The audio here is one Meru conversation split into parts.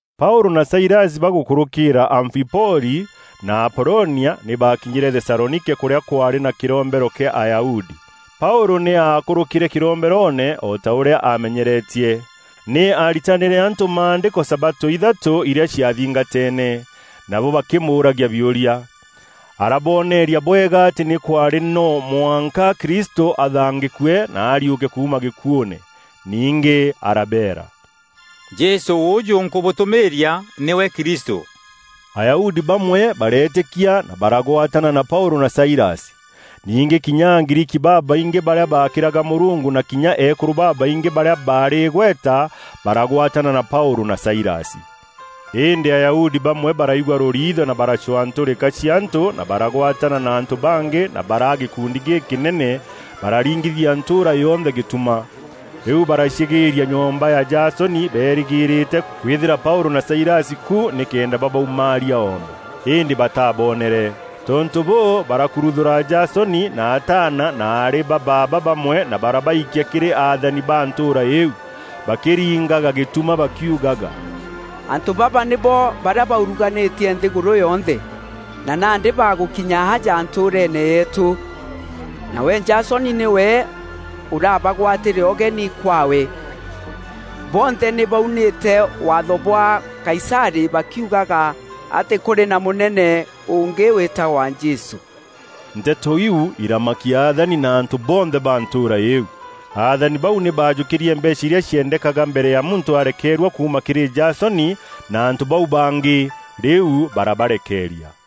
Paûlû na Sailasi bagûkûrûkîîra Amfipoli na Apolonia, nî baakinyîre Thesalonike kûrîa kwaarî na kîrombero kîa Ayahudi. Paûlû nî aakûrûkîre kîromberoone o ta ûrîa aamenyeretie. Nî aaritanîre antû maandîko sabatû ithatû irîa ciathingateene, nabo bakîmûûragia biûria. Arabooneria bwega atî nî kwaarî no mwanka Kristû athangîkue na ariûke kuuma gîkuûûne. Ningî arabeera, “Jesû ûûjû, nkûbûtûmîîria nîwe Kristû.” Ayahudi bamwe bareetîkia na baragwatana na Paûlû na Sailasi. Ningî kinya Agriiki babaingî barîa baakîraga Mûrungu na kinya eekûrû babaingî barîa baarî îgweta baragwatana na Paûlû na Sailasi. Îndî Ayahudi bamwe baraigua rûriitho na baracwaa ntûrîka cia antû na baragwatana na antû bangî na baraa gîkundi gîkînene, bararingithia ntûûra yonthe gîtuma. Rîu baracîgîria nyomba ya Jasoni beerîgîîrîte kwîthîra Paûlû na Sailasi ku nîkenda babaumaaria oome. Îndî bataabonere. Tontû bûû, barakuruthûra Jasoni na ataana na aarî ba baaba bamwe na barabaikia kîrî athani ba ntûûra îîu, bakîringaga gîtuma bakiugaga, “Antû baba nîbo barîa bauruganîtie nthîgûrû yonthe, na nandî bagûkinya aja ntûûreene yeetû. Nawe Jasoni nîwe ûrabagwatîre ûgeni kwaawe. Bonthe nî baunîte waatho bwa Kaisarî bakiugaga atî kûrî na mûnene ûngî wîtagwa Jesû.” Nteto iu iramakia athani na antû bonthe ba ntûûra îîu. Aathani bau nî baajûkîrie mbeecha irîa ciendekaga mbere ya muntû arekeerua kuuma kîrî Jasoni na antû bau bangî, rîu barabarekeeria.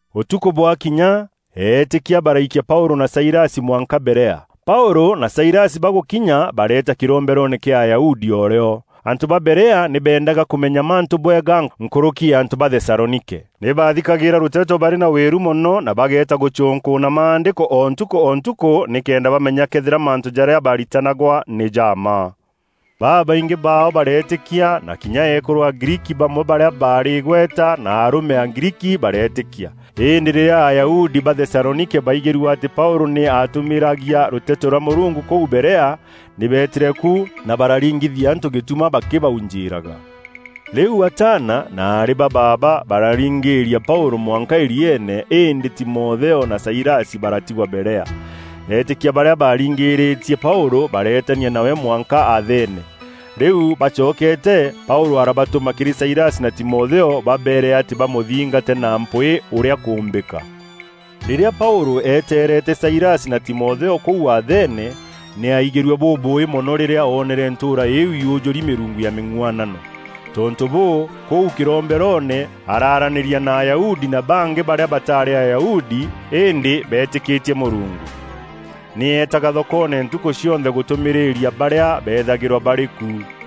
Ûtukû bwakinya, eetîkia baraikia Paûlû na Sailasi mwanka Berea. Paûlû na Sailasi bagûkinya bareeta kîromberoone kîa Ayahudi o rîo. Antû ba Berea nî beendaga kûmenya mantû bwega nkûrûki ya antû ba Thesalonike. Nî baathîkagîîra rûteto barî na wîru mono na bageeta gûcûnkûûna Maandîko o ntukû o ntukû nîkenda bamenya këethîra mantû jarîa baarîtanagwa nî ja mma. Babaingî baao bareetîkia, na kinya eekûrû Agriiki bamwe barîa baarî îgweta na arûme Agriiki bareetîkia. Îndî rîrîa Ayahudi ba Thesalonike baigîrue atî Paûlû nî aatûmîîragia rûteto rwa Mûrungu kûu Berea, nî beetîre ku, na bararingithia antû gîtuma bakîbaujîîraga. Rîu ataana na aarî ba baaba bararingîîria Paûlû mwanka îrîeene îndî Timotheo na Sailasi baratigwa Berea. Eetîkia barîa baaringîrîtie Paûlû, bareetania nawe mwanka Athene. Rîu baacokeete, Paûlû arabatûma kîrî Sailasi na Timotheo babeere atî bamûthingate na mpwîî ûrîa kûûmbîka. Rîrîa Paûlû eeteerete Sailasi na Timotheo kûu Athene, nî aaigîrue bûbûûî mono rîrîa oonere ntûûra îîu yûjûri mîrungu ya mîng'uanano. Tontû bûû, kûu kîromberoone araaranîria na Ayahudi na bangî barîa batarî Ayahudi îndî beetîkîtie Mûrungu. Nî eetaga thokoone ntukû cionthe gûtûmîrîria barîa beethagîrwa barî ku.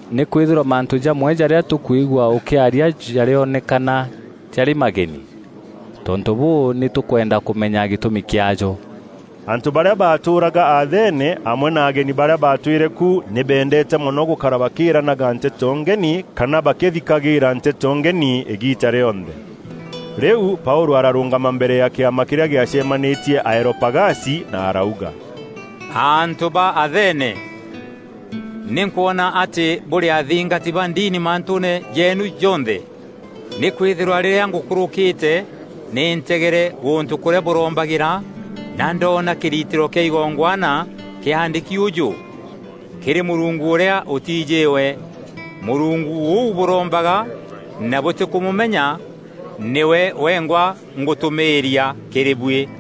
Nîkwîthîrwa mantû jamwe jarîa tûkwigua ûkîarîa jarîonekana jarî mageni. Tontû bûû, nî tûkwenda kûmenya gîtûmi kîaajo.” Antû barîa baatûûraga Athene amwe na ageni barîa baatwîre ku nî beendeete mono gûkara bakîranaga nteto ngeni kana bakîthikagîîra nteto ngeni îgiita rîonthe. Rîu Paûlû ararûngama mbere ya kîama kîrîa gîacemanîtie Areopagasi na arauga, “Antû ba Athene! Nî nkwona atî bûrî athingati ba ndini mantûûne jeenu jonthe. Nîkwîthîrwa rîrîa ngûkûrûkîte nî ntegere gûntû kûrîa bûrombagîra, na ndoona kîritîro kîa igongwana kîaandîki ûjû: ‘Kîrî mûrungu ûrîa ûtiijîwe.’ Mûrungu ûu bûrombaga na bûtîkûmûmenya nîwe wengwa ngûtûmîîria kîrî buî.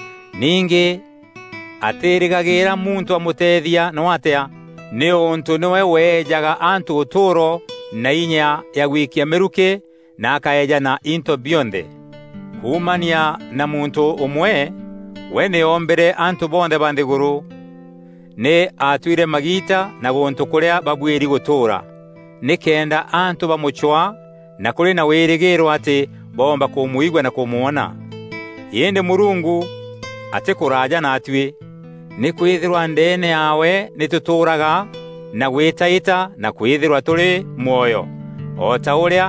Ningî atîîrîgagîîra muntû amûteethia noo atîa nîûntû nîwe weejaga antû ûtûûro na inya ya gwikia mîrukî na akaeejana into bionthe. Kuumania na muntû ûmwe, we nî oombîre antû bonthe ba nthîgûrû. Nî aatuîre magiita na gûntû kûrîa babuîri gûtûûra nîkenda antû bamûcwaa na kûrî na wîrîgîîro atî boomba kûmwigua na kûmwona. Îndî Mûrungu atîkûraaja naatuî. Nîkwîthîrwa ‘Ndeene yaawe nî tûtûûraga na gwîtaîta na kwîthîrwa tûrî mwoyo,’ O ta ûrîa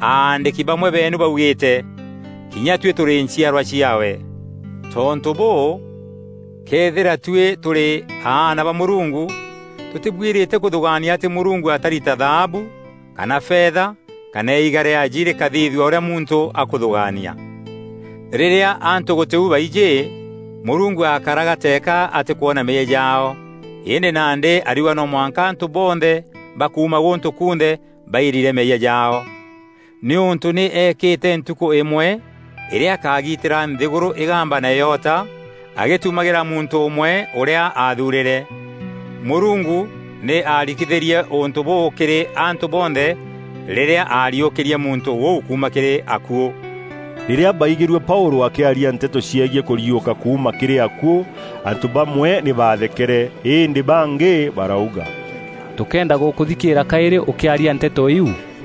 aandîki bamwe beenu baugîîte: ‘Kinya tuî tûrî nchîarwa ciaawe.’ “Tontû bûû, këethîra tuî tûrî aana ba Mûrungu, tûtîbuîrîte kûthûgaania atî Mûrungu akari ta thaabu, kana fetha kana iiga rîaji rîkathithua ûrîa muntû akûthûgaania. Rîrîa antû gûtî u baijî, Mûrungu aakaraga teeka atîkwona meeyia jaao, îndî nandî ariuga no mwanka antû bonthe ba kuuma gûntû kunthe bairire meeyia jaao nîûntû nî eekîte ntukû îmwe îrîa akagitîra nthîgûrû îgamba na îota agîtumagîra muntû ûmwe ûrîa aathuurîre. Mûrungu nî aarikithîrie ûntû bûû kîrî antû bonthe rîrîa aariûkîrie muntû ûu kuuma kîrî akuû!” Rîrîa baigîrue Paûlû akîaria nteto ciegiî kûriûka kuuma kîrî akuû, antû bamwe nî baathekere, îndî bangî barauga, “Tûkeenda gûkûthikîîra kaîrî ûkîaria nteto iu!”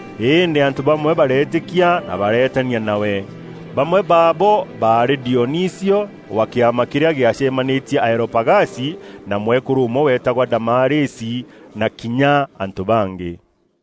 Îndî antû bamwe bareetîkia na bareetania nawe. Bamwe baabo baarî Dionisio wa kîama kîrîa gîacemanîtie Areopagasi, na mwekûrû ûmwe weetagwa Damarisi na kinya antû bangî.